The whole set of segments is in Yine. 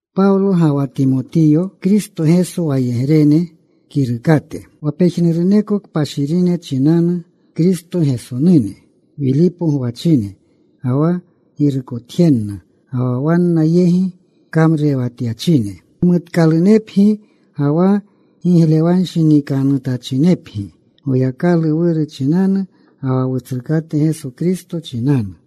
Pawlo ga wa Timotiyo, Kristo Geso wayegrene, kirukate. Wa pejnuruneko kpashirine chinanu Kristo Gesonune, Wilipo gwachine, ga wa girukotjenna ga wa wanna yegi kamrurewatyachine. Gimutkalunepgi ga wa giglewanshinikanutachinepgi Goyakalu Wuru chinanu ga wa Wutsrukate Geso Kristo chinanu.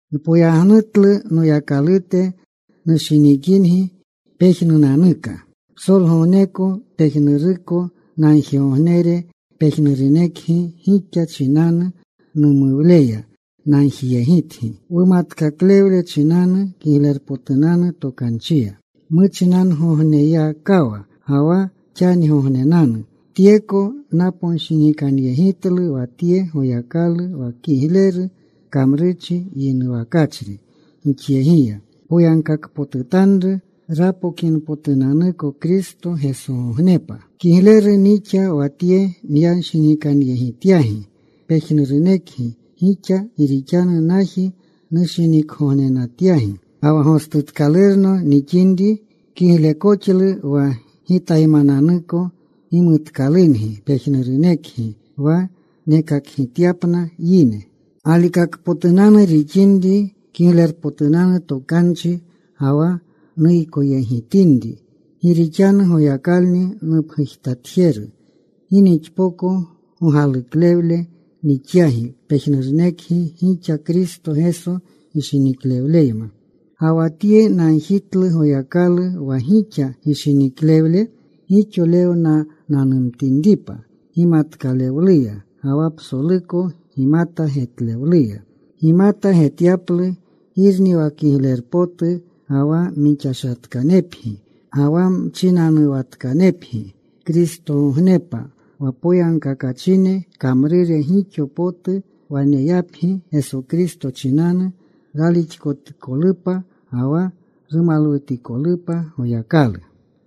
Npoyagnutlu Noyakalute nushinikingi pejnunanuka, psolgogneko pejnuruko nagjigognere pejnurunekgi gixa chinanu, numuwleya nagjiyegitgi, wumatkaklewle chinanu Kiglerpotunanu Tokanchiya, muchinangogneyakawa ga wa xanigognenanu. Tyeko naponshinikanyegitlu wa tye, Goyakalu wa kigleru kamrurchi yinuwakachri gixyegiya, poyagkakpotutanru rapokinpotunanuko Kristo Gesogognepa. Kigleru nixa wa tye nyanshinikanyegityagi pejnurunekgi gixa. Gi rixanu naji nushinikgognenatyagi. Ga wa gostutkalurno nixinri, kiglekoxlu wa gitaymananuko gimutkalungi pejnurunekgi, wa nekakgityapna yine galikakpotunanu rixinri Kiglerpotunanu Tokanchi, ga wa nuykoyegitinri. Gi rixanu Goyakalni nupgujtatjeru gi nixpoko gogaluklewle nixyagi pejnurunekgi gixa Kristo Geso gishiniklewleyma. Ga wa tye nagjitlu Goyaklu wa gixa gishiniklewle gixolewnananumtinripa gimatkalewluya ga wa psoluko gimata getlewluya. Gimata getyaplu girni wa kiglerpotu. Ga wa mixashatkanepgi, ga wa mchinanuwatkanepgi Kristogognepa. Wa poyagkakachine kamrure gixo potu waneyapgi Geso Kristo chinanu, ralixkotikolupa ga wa rumalwutikolupa Goyakalu.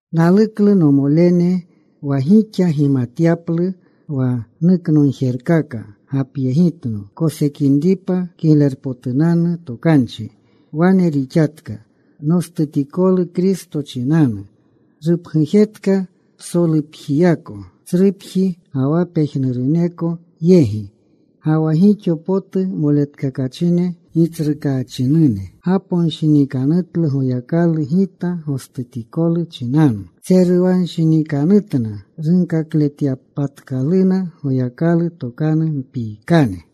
Naluklu, nomolene, wa gixa gimatyaplu wa nuknogjerkaka gapyegitno kosekinripa Kiglerpotunanu Tokanchi. Wane rixatka nostutikolu Kristo chinanu rupgujetka psolupjiyako tsrupji, ga wa pejnuruneko yegi. Ga wa gixo potu moletkakachine Gitsrukaachinune gaponshinikanutlu Goyakalu gita gostutikolu chinanu. Tseruwanshinikanutna runkakletyapatkaluna Goyakalu tokanu mpiikane.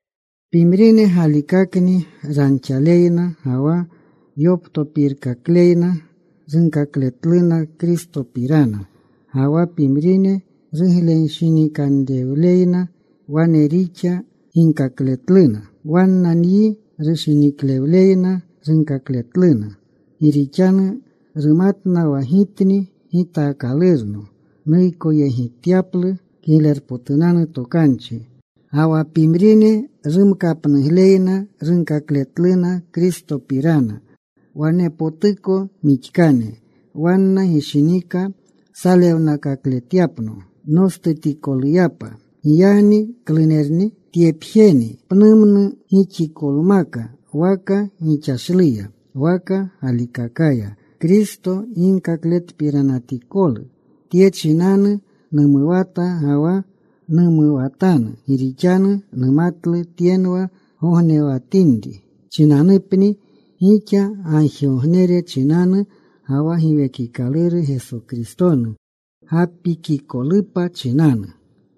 Pimrine galikakni ranxaleyna ga wa yoptopirkakleyna, runkakletluna Kristopirana. Ga wa pimrine ruglenshinikanrewleyna wane rixa ginkakletluna. Wanna nyi rushiniklewleyna runkakletluna, gi rixanu rumatna wa gitni gitaakalurno nuykoyegityaplu Kiglerpotunanu Tokanchi. Ga wa pimrine rumkapnugleyna runkakletluna Kristopirana. Wanepotuko mixkane. Wanna gishinika salewnakakletyapno nostutikoluyapa. Giyagni ¿klunerni? Tyepjeni. Pnumnu gixikolmaka, waka gixashluya waka galikakaya, Kristo ginkakletpiranatikolu. Tye chinanu numuwata ga wa numuwatanu. Gi rixanu numatlu tyenwa nognewatinri chinanupni gixa gagjigognere chinanu, ga wa Giwekikaluru Geso Kristonu gapikikolupa chinanu.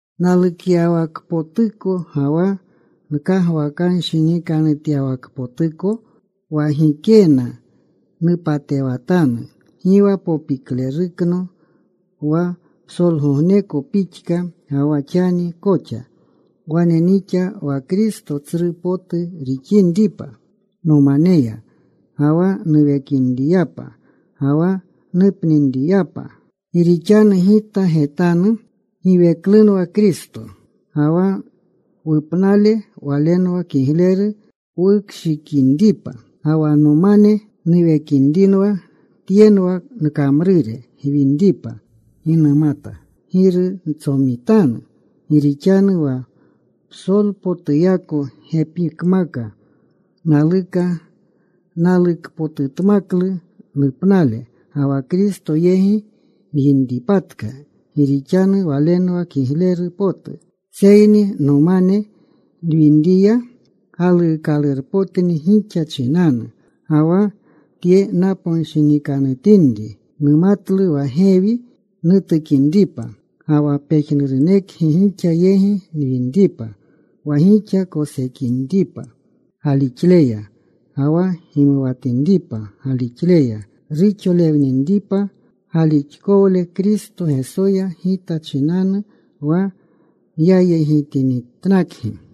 Nalukyawakpotuko ga wa nkagwakanshinikanutyawakpotuko, wa gikena nupatewatanu, gi wa popiklerukno wa psolgogneko pixka ga wa xani koxa. Wane nixa wa Kristo tsru potu rixinripa nomaneya, ga wa nuwekinriyapa ga wa nupninriyapa. Gi rixanu gita getanu giweklunwa Kristo, ga wa wupnale walenwa kigleru wukshikinripa. Ga wa nomane nuwekinriwa tyenwa nkamrure gwinripa. Gi numata giru ntsomitanu. Gi rixanu wa psolpotuyako gepikmaka naluka. Nalukpotutmaklu nupnale ga wa Kristo yegi nwinripatka gi rixanu walenwa kigleru potu. Seyni nomane nwinriwa galuukalurpotni gixa chinanu. Ga wa tye naponshinikanutinri, numatlu wa gewi nutukinripa. Ga wa pejnurunekgi gixa yegi nwinripa. Wa gixa kosekinripa galixleya ga wa gimuwatinripa galixleya, ruxolewninripa galixkowle Kristo Gesoya gita chinanu wa nyayegitinitnakgi.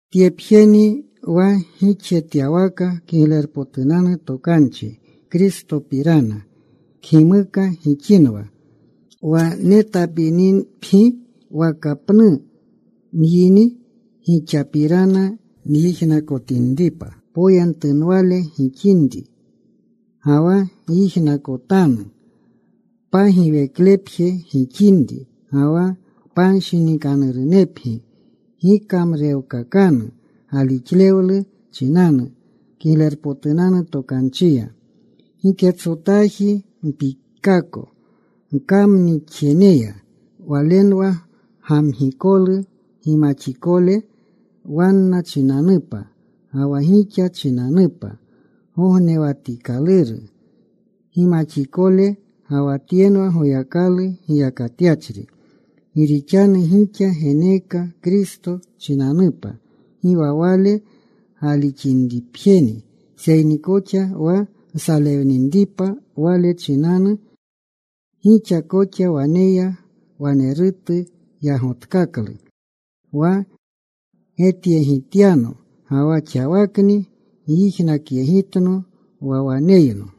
Tyepjeni. Wa gixjetyawaka Kiglerpotunanu Tokanchi Kristopirana kgimuka gixinwa, wa netapinipgi waka pnu nwini, gixapirana nyijnakotinripa poyentunwale gixinri. Ga wa nyijnakotanu pagiweklepje gixinri, ga wa panshinikanurunepgi, gikamrurewkakanu galixlewlu chinanu Kiglerpotunanu Tokanchiya. Giketsotaji mpiikaako gkamnixjeneya. Walenwa gamgikolu gimaxikole wanna chinanupa ga wa gixa chinanupa gognewatikaluru gimaxikole. Ga wa tyenwa Goyakalu giyakatyachri. Gi rixanu gixa geneeka Kristo chinanupa gi wa Wale galixinripjeni seyni koxa wa nsalewninripa Wale chinanu. Gixa koxa waneya walerutu yagotkaklu, wa getyegityano, ga wa xawakni gyijnakyegitno wa waneyno.